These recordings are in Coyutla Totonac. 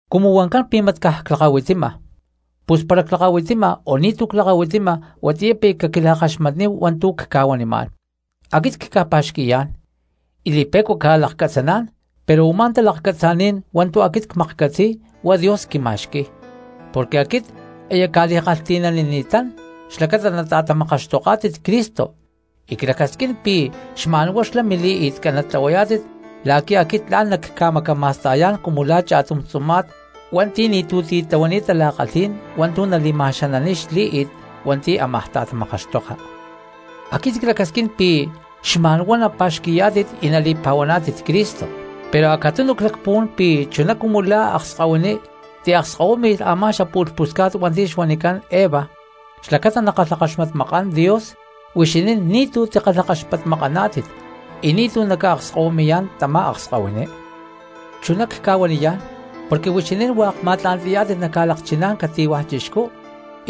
Cumu huancán pi̠ mat caj clakahuitima, pus para clakahuitima o ni̠tu̠ clakahuitima huatiyá pi̠ caquila̠kaxmatníhu hua̠ntu̠ cca̠huanimá̠n. Aquit cca̠pa̠xqui̠yá̠n y li̠pe̠cua cca̠lakcatzaná̠n, pero u̠má talakcatzaní̠n hua̠ntu̠ aquit cmaklhcatzi̠y huá Dios quima̠xqui̠y, porque aquit aya cca̠kalhti̠nanini̠tán xlacata nata̠tamakaxtoká̠tit Cristo y clacasquín pi̠ xma̠nhuá xlá mili̠i̠tcán natlahuayá̠tit la̠qui̠ aquit tla̠n nacca̠macama̠sta̠yá̠n cumu la̠ cha̠tum tzuma̠t hua̠nti̠ ni̠tu̠ titlahuani̠t tala̠kalhí̠n hua̠ntu̠ nali̠ma̠xananiy xlí̠i̠t hua̠nti̠ ámaj ta̠tamakaxtoka. Aquit clacasquín pi̠ xma̠nhuá napa̠xqui̠yá̠tit y nali̠pa̠huaná̠tit Cristo, pero acatunu clacpuhuán pi̠ chuná cumu la̠ akskahuiní tiakskahuími̠lh a̠má xapu̠lh pusca̠t hua̠nti̠ xuanicán Eva xlacata nakalhakaxmatmakán Dios, huixinín ni̠tu̠ tikalhakaxpatmakaná̠tit y ni̠tu̠ naca̠akskahuimi̠yá̠n tamá akskahuiní. Chuná cca̠huaniyá̠n porque huixinín hua̠k ma̠tla̠nti̠yá̠tit naca̠lakchiná̠n cati̠huaj chixcú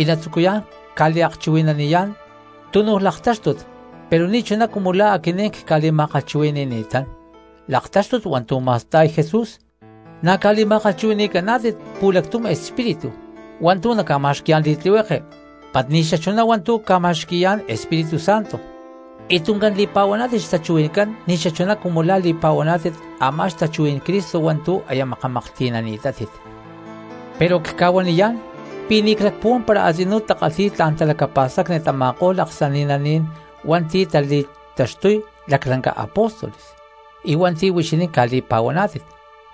y natzucuyá̠n ca̠liakchuhui̠naniyá̠n tunu laktáxtut pero ni̠chuná cumu la̠ aquinín cca̠li̠ma̠kalhchuhui̠ni̠ni̠tán laktáxtut hua̠ntu̠ ma̠sta̠y Jesús, na̠ ca̠li̠ma̠kalhchuhui̠ni̠caná̠tit pu̠lactum espíritu hua̠ntu̠ naca̠ma̠xqui̠yá̠n li̠tlihueke mat ni̠xachuná hua̠ntu̠ ca̠ma̠xqui̠yá̠n Espíritu Santo, y tuncán li̠pa̠huaná̠tit xtachuhuí̠ncán ni̠xachuná cumu la̠ li̠pa̠huaná̠tit a̠má xtachuhuí̠n Cristo hua̠ntu̠ aya makamaklhti̠nani̠tátit. Pero cca̠huaniyá̠n pi̠ ni̠ clacpuhuán para a̠tzinú takalhi̠y tla̠n talacapa̠stacni tama̠ko̠lh aksani̠naní̠n hua̠nti̠ tali̠taxtuy laclanca apóstoles y hua̠nti̠ huixinín ca̠li̠pa̠huaná̠tit.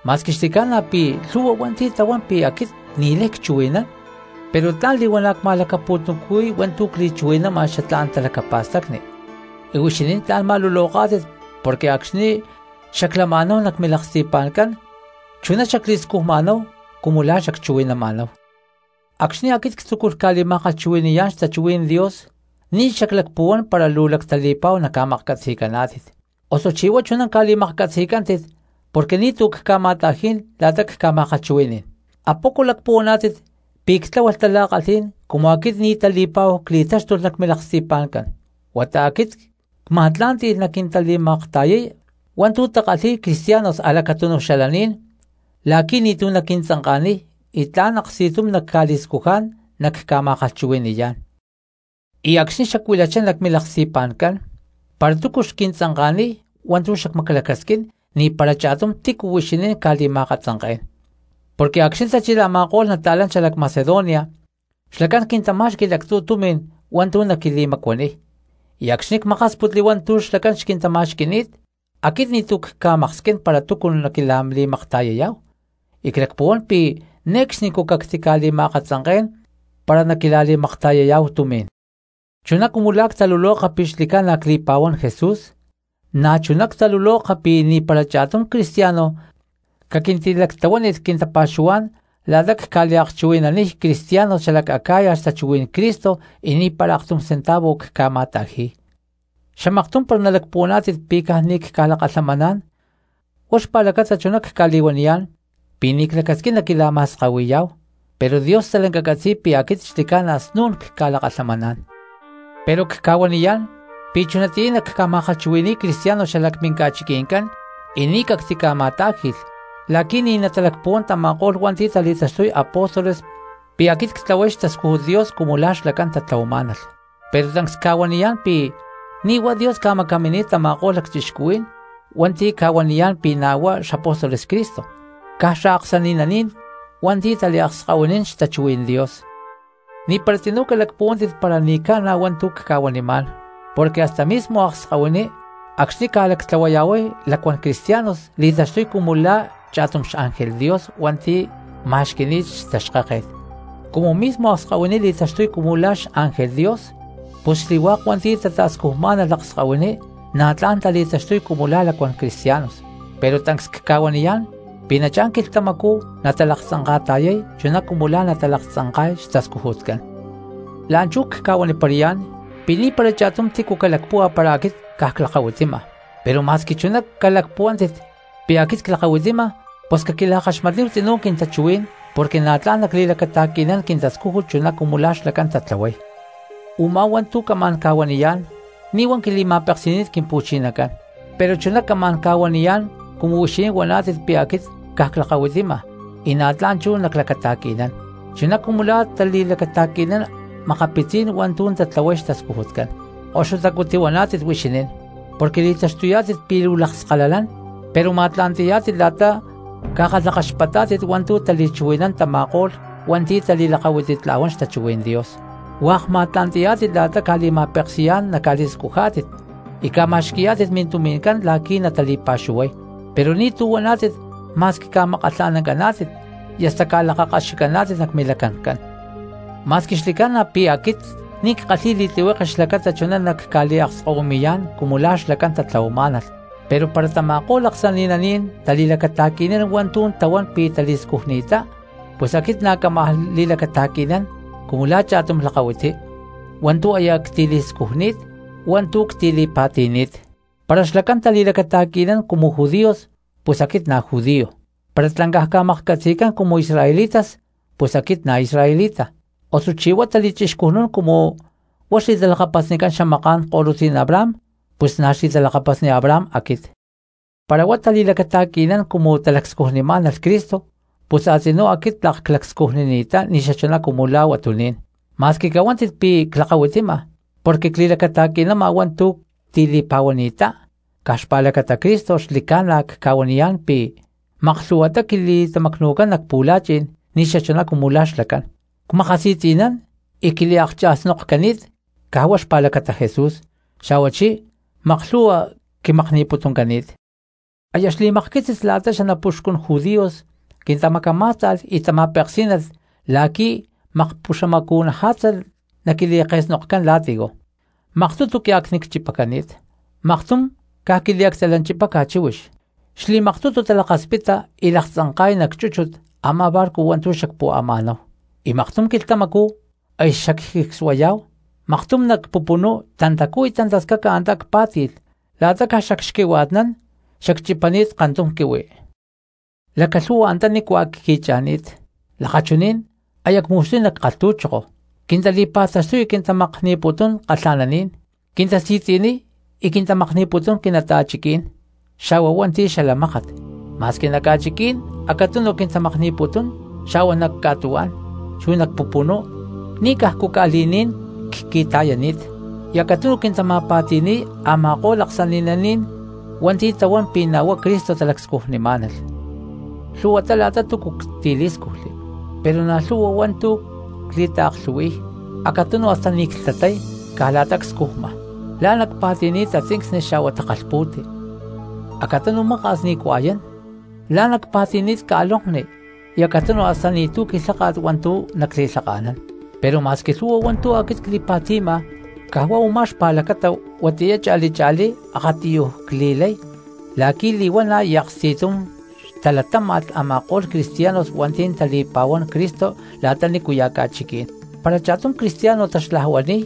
Ma̠squi xli̠ca̠na pi̠ lhu̠hua hua̠nti̠ tahuán pi̠ aquit ni̠lay cchuhui̠nán, pero tla̠n li̠huana̠ cma̠lacapu̠tuncuhui̠y hua̠ntu̠ cli̠chuhui̠nama xatlá̠n talacapa̠stacni, y huixinín tla̠n ma̠luloká̠tit porque acxni̠ xaclama̠náhu nac milaksti̠pa̠ncán chuná xacli̠scujma̠náhu cumu la̠ xacchuhui̠nama̠náhu. Acxni̠ aquit ctzúculh ca̠li̠ma̠kalhchuhui̠ni̠yá̠n xtachuhuí̠n Dios ni̠ xaclacpuhuán para luu lactali̠pa̠hu naca̠maklhcatzi̠caná̠tit, ¿osuchí huá chuná ca̠li̠maklhcatzi̠cántit porque ni̠tu̠ cca̠ma̠ta̠jí̠n la̠ta cca̠ma̠kalhchuhui̠ní̠n? ¿Apoco lacpuhuaná̠tit pi̠ ctláhualh tala̠kalhí̠n cumu aquit ni̠ tali̠pa̠hu cli̠táxtulh nac milaksti̠pa̠ncán? Huata aquit cma̠tlá̠nti̠lh naquintali̠makta̠yay hua̠ntu̠ takalhi̠y cristianos a̠lacatúnuj xalaní̠n la̠qui̠ ni̠tu̠ naquintzanka̠niy y tla̠n aksti̠tum nacca̠li̠scujá̠n nacca̠ma̠kalhchuhui̠ni̠yá̠n. Y acxni̠ xacuilachá nac milaksti̠pa̠ncán para túcu xquintzanka̠niy hua̠ntu̠ xacmaclacasquín, ni̠para cha̠tum tícu huixinín cca̠li̠ma̠akatzanké̠n, porque acxni̠ tachilh a̠ma̠ko̠lh nata̠lán xalac Macedonia xlacán quintamá̠xqui̠lh actzu̠ tumi̠n hua̠ntu̠ naquili̠macuaniy, y acxni̠ cmakásputli hua̠ntu̠ xlacán xquintama̠xqui̠ni̠t aquit ni̠tu̠ cca̠maksquín para túcu naquila̠li̠makta̠yayá̠hu; y clacpuhuán pi̠ ne̠cxnicú cactica̠li̠ma̠akatzanké̠n para naquila̠li̠makta̠yayá̠hu tumi̠n. Chuná cumu la̠ ctaluloka pi̠ xli̠ca̠na cli̠pa̠huán Jesús na̠chuná ctaluloka pi̠ ni̠para cha̠tum cristiano caquintilactlahuánilh quintapa̠xuhuá̠n la̠ta cca̠liakchuhui̠naniy cristianos xalac Acaya xtachuhuí̠n Cristo y ni̠para aktum centavo cca̠ma̠ta̠ji̠y. Xamaktum para nalacpuhuaná̠tit pi̠ caj ni̠ cca̠lakalhamaná̠n huá xpa̠lacata chuná cca̠li̠huaniyá̠n pi̠ ni̠ clacasquín naquila̠ma̠skahui̠yá̠hu, pero Dios stalanca catzi̠y pi̠ aquit xli̠ca̠na snún cca̠lakalhamaná̠n. Pero cca̠huaniyá̠n pi̠ chunatiyá nacca̠ma̠kalhchuhui̠ni̠y cristianos xalac minca̠chiqui̠ncán y ni̠ cactica̠ma̠tá̠ji̠lh, la̠qui̠ ni̠ natalacpuhuán tama̠ko̠lh hua̠nti̠ tali̠taxtuy apóstoles pi̠ aquit ctlahuay xtascújut Dios cumu la̠ xlacán tatlahuamá̠nalh. Pero tancs cca̠huaniyá̠n pi̠ ni̠ huá Dios ca̠macamini̠t tama̠ko̠lh lacchixcuhuí̠n hua̠nti̠ ca̠huaniyá̠n pi̠ na̠ huá xapóstoles Cristo, caj xaaksani̠naní̠n hua̠nti̠ taliakskahuinín xtachuhuí̠n Dios. Ni̠para tzinú calacpuhuántit para ni̠ ca̠na hua̠ntu̠ cca̠huanimá̠n porque hasta mismo akskahuiní acxni̠ ca̠lactlahuayá̠huay lacuán cristianos li̠taxtuy cumu la̠ cha̠tum xángel Dios hua̠nti̠ ma̠xqui̠ni̠t xtaxkáket. Cumu mismo akskahuiní li̠taxtuy cumu la̠ xángel Dios, pus xli̠hua̠k hua̠nti̠ tata̠scujmá̠nalh akskahuiní na̠ tla̠n tali̠taxtuy cumu la̠ lacuán cristianos, pero tancs cca̠huaniyá̠n pi̠ nachá̠n quilhtamacú natalaktzanka̠ta̠yay chuná cumu la̠ nalaktzanka̠y xtascujutcán. La̠nchú cca̠huaniparayá̠n pi̠ ni̠para cha̠tum tícu calacpúhua para aquit caj clakahuitima; pero ma̠squi chuná calacpuhuántit pi̠ aquit clakahuitima pus caquila̠kaxmatníhu tzinú quintachuhuí̠n porque na̠ tla̠n nacli̠lacata̠qui̠nán quintascújut chuná cumu la̠ xlacán tatlahuay. Umá hua̠ntu̠ camá̠n ca̠huaniyá̠n ni̠ huá quili̠ma̠peksi̠ni̠t Quimpu̠chinacán, pero chuná camá̠n ca̠huaniyá̠n cumu huixinín huaná̠tit pi̠ aquit caj clakahuitima y na̠ tla̠n chú naclacata̠qui̠nán chuná cumu la̠ tali̠lacata̠qui̠nán makapitzí̠n hua̠ntu̠ tatlahuay xtascujutcán. Koxutacú tihuaná̠tit huixinín, porque li̠taxtuyá̠tit pi̠ luu lakskalalán pero ma̠tla̠nti̠yá̠tit la̠ta ca̠kalhakaxpatá̠tit hua̠ntu̠ tali̠chuhui̠nán tama̠ko̠lh hua̠nti̠ tali̠lakahuititla̠huán xtachuhuí̠n Dios, hua̠k ma̠tla̠nti̠yá̠tit la̠ta ca̠li̠ma̠peksi̠yá̠n naca̠li̠scujá̠tit y ca̠ma̠xqui̠yá̠tit mintumi̠ncán la̠qui̠ natali̠pa̠xuhuay, pero ni̠tu̠ huaná̠tit ma̠squi ca̠makkalha̠nancaná̠tit, y hasta ca̠lakakaxicaná̠tit nac milacancán. Ma̠squi xli̠ca̠na pi̠ aquit ni̠ ckálhi̠lh li̠tlihueke xlacata chuná nacca̠liakskahuimi̠yá̠n cumu la̠ xlacán tatlahuamá̠nalh. Pero para tama̠ko̠lh aksani̠naní̠n tali̠lacata̠qui̠nán hua̠ntu̠ tahuán pi̠ tali̠scujni̠ttá pus aquit na̠ cámaj li̠lacata̠qui̠nán cumu la̠ cha̠tum lakahuiti hua̠ntu̠ aya ctili̠scujni̠t chu hua̠ntu̠ ctili̠pa̠ti̠ni̠t. Para xlacán tali̠lacata̠qui̠nán cumu judíos pus aquit na̠ judío; para tlancaj ca̠maklhcatzi̠cán cumu israelitas pus aquit na̠ israelita; osuchí huá tali̠chixcujnún cumu huá xli̠talakapasnicán xamaká̠n ko̠lutzí̠n Abraham pus na̠ xli̠talakapasni Abraham aquit. Para huá tali̠lacata̠qui̠nán cumu talacscujnimá̠nalh Cristo pus a̠tzinú aquit tlak clacscujnini̠ttá ni̠xachuná cumu la̠ huatuní̠n. Ma̠squi cahuántit pi̠ clakahuitima porque cli̠lacata̠qui̠nama hua̠ntu̠ ctili̠pa̠ti̠ni̠ttá caj xpa̠lacata Cristo xli̠ca̠na cca̠huaniyá̠n pi̠ maklhu̠huatá quili̠tamacnu̠cán nac pu̠la̠chi̠n ni̠xachuná cumu la̠ xlacán; cmakasi̠tzi̠nán y quiliaklhcha̠snokcani̠t caj huá xpa̠lacata Jesús, xa̠huachí maklhu̠hua quimakni̠putuncani̠t. Aya xli̠makquitzis la̠ta xanapuxcun judíos quintamacamá̠sta̠lh y tama̠peksí̠nalh la̠qui̠ makpuxamacu̠naja̠tza naquili̠ke̠snokcán latigo. Maktutu quiacnicchipacani̠t, maktum caj quiliactalanchipáca chíhuix. Xli̠maktutu talakaspita y laktzanka̠y nac chúchut a̠má barco hua̠ntu̠ xacpu̠ama̠náhu, y maktum quilhtamacú aya xacjicsuay, maktum nac pupunú tantacú y tantascaca antá cpá̠ti̠lh la̠ta caj xacxquihua̠tnán xacchipama paktum quihui. Lacalhu̠hua antá nícua cqui̠cha̠ni̠t lakachuní̠n aya cmu̠xtuy nac kalhtu̠choko; quintali̠pa̠taxtuy y quintamakni̠putún kalha̠naní̠n; quintasi̠tzi̠niy y quintamakni̠putún quinata̠chiquí̠n xa̠hua hua̠nti̠ xala mákat. Ma̠squi nac ca̠chiquí̠n acatunu quintamakni̠putún, xa̠hua nac ca̠tuhuá̠n chu nac pupunú ni̠cajcu ca̠li̠ní̠n cqui̠ta̠yani̠t; y acatunu quintama̠pa̠ti̠ni̠y a̠ma̠ko̠lh aksani̠naní̠n hua̠nti̠ tahuán pi̠ na̠ huá Cristo talacscujnimá̠nalh. Lhu̠huatá la̠ta túcu ctilí̠scujli, pero na̠ lhu̠hua hua̠ntu̠ cli̠taaklhu̠hui̠y, acatunu hasta ni̠ clhtatay caj la̠ta cscujma; la̠ná cpa̠ti̠ni̠t tatzincsni xa̠hua takalhpu̠ti; acatunu maka̠s ni̠ cua̠yán; la̠ná cpa̠ti̠ni̠t ca̠lonkni; y acatunu hasta ni̠tu̠ quilháka̠t hua̠ntu̠ nacli̠lhaka̠nán. Pero ma̠squi lhu̠hua hua̠ntu̠ aquit cli̠pa̠ti̠ma caj huá u̠má xpa̠lacata chunatiyá cha̠li cha̠lí akatiyuj cli̠lay la̠qui̠ li̠huana̠ y aksti̠tum xtalatáma̠lh a̠ma̠ko̠lh cristianos hua̠nti̠ tali̠pa̠huán Cristo la̠ta nícuya̠ ca̠chiquí̠n. Para cha̠tum cristiano taxlajuani̠y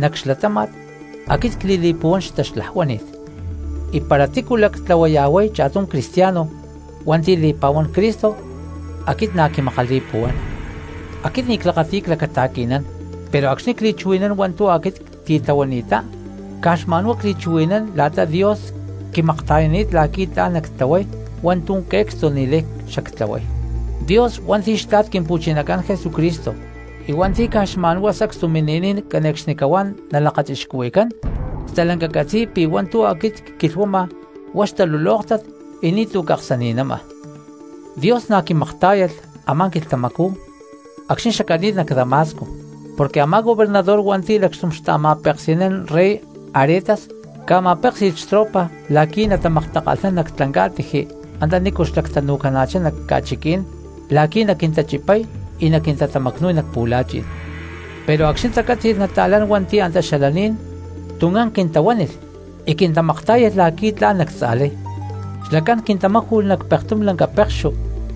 nac xlatáma̠t aquit cli̠li̠puhuán xtaxlajuánit, y para tícu lactlahuaya̠huay cha̠tum cristiano hua̠nti̠ li̠pa̠huán Cristo aquit na̠ quimakali̠puhuán. Aquit ni̠ clakati̠y clacata̠qui̠nán pero acxni̠ cli̠chuhui̠nán hua̠ntu̠ aquit ctitlahuani̠ttá caj xma̠nhuá cli̠chuhui̠nán la̠ta Dios quimakta̠yani̠t la̠qui̠ tla̠n nactlahuay hua̠ntu̠ que̠cstu ni̠lay xactlahuay. Dios hua̠nti̠ xtla̠t Quimpu̠chinacán Jesucristo y hua̠nti̠ caj xma̠nhuá sacstu mini̠niy cane̠cxnicahuá nalakachixcuhui̠cán stalanca catzi̠y pi̠ hua̠ntu̠ aquit cquilhuama huá xtalulóktat y ni̠tu̠ caksani̠nama. Dios na̠ quimaktá̠yalh a̠má quilhtamacú acxni̠ xacani̠t nac Damasco, porque a̠má gobernador hua̠nti̠ lacxtum xta̠ma̠peksi̠nán rey Aretas ca̠ma̠péksi̠lh xtropa la̠qui̠ natamaktakalhnán nac tlancá̠tiji antanícu xlactanu̠cana̠chá nac ca̠chiquí̠n la̠qui̠ naquintachipay y naquintatamacnu̠y nac pu̠la̠chi̠n. Pero acxni̠ tacátzi̠lh nata̠lán hua̠nti̠ antá xalaní̠n tuncán quintahuánilh y quintamaktá̠yalh la̠qui̠ tla̠n nactza̠lay, xlacán quintamáju̠lh nac pa̠tum lanca pekxu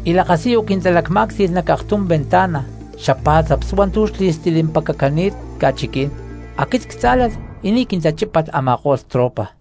y lakasiyu quintalacmá̠cti̠lh nac aktum ventana xapá̠tzaps hua̠ntu̠ xli̠stilimpacacani̠t ca̠chiquí̠n, aquit ctzá̠lalh y ni̠ quintachípalh a̠ma̠ko̠lh tropa.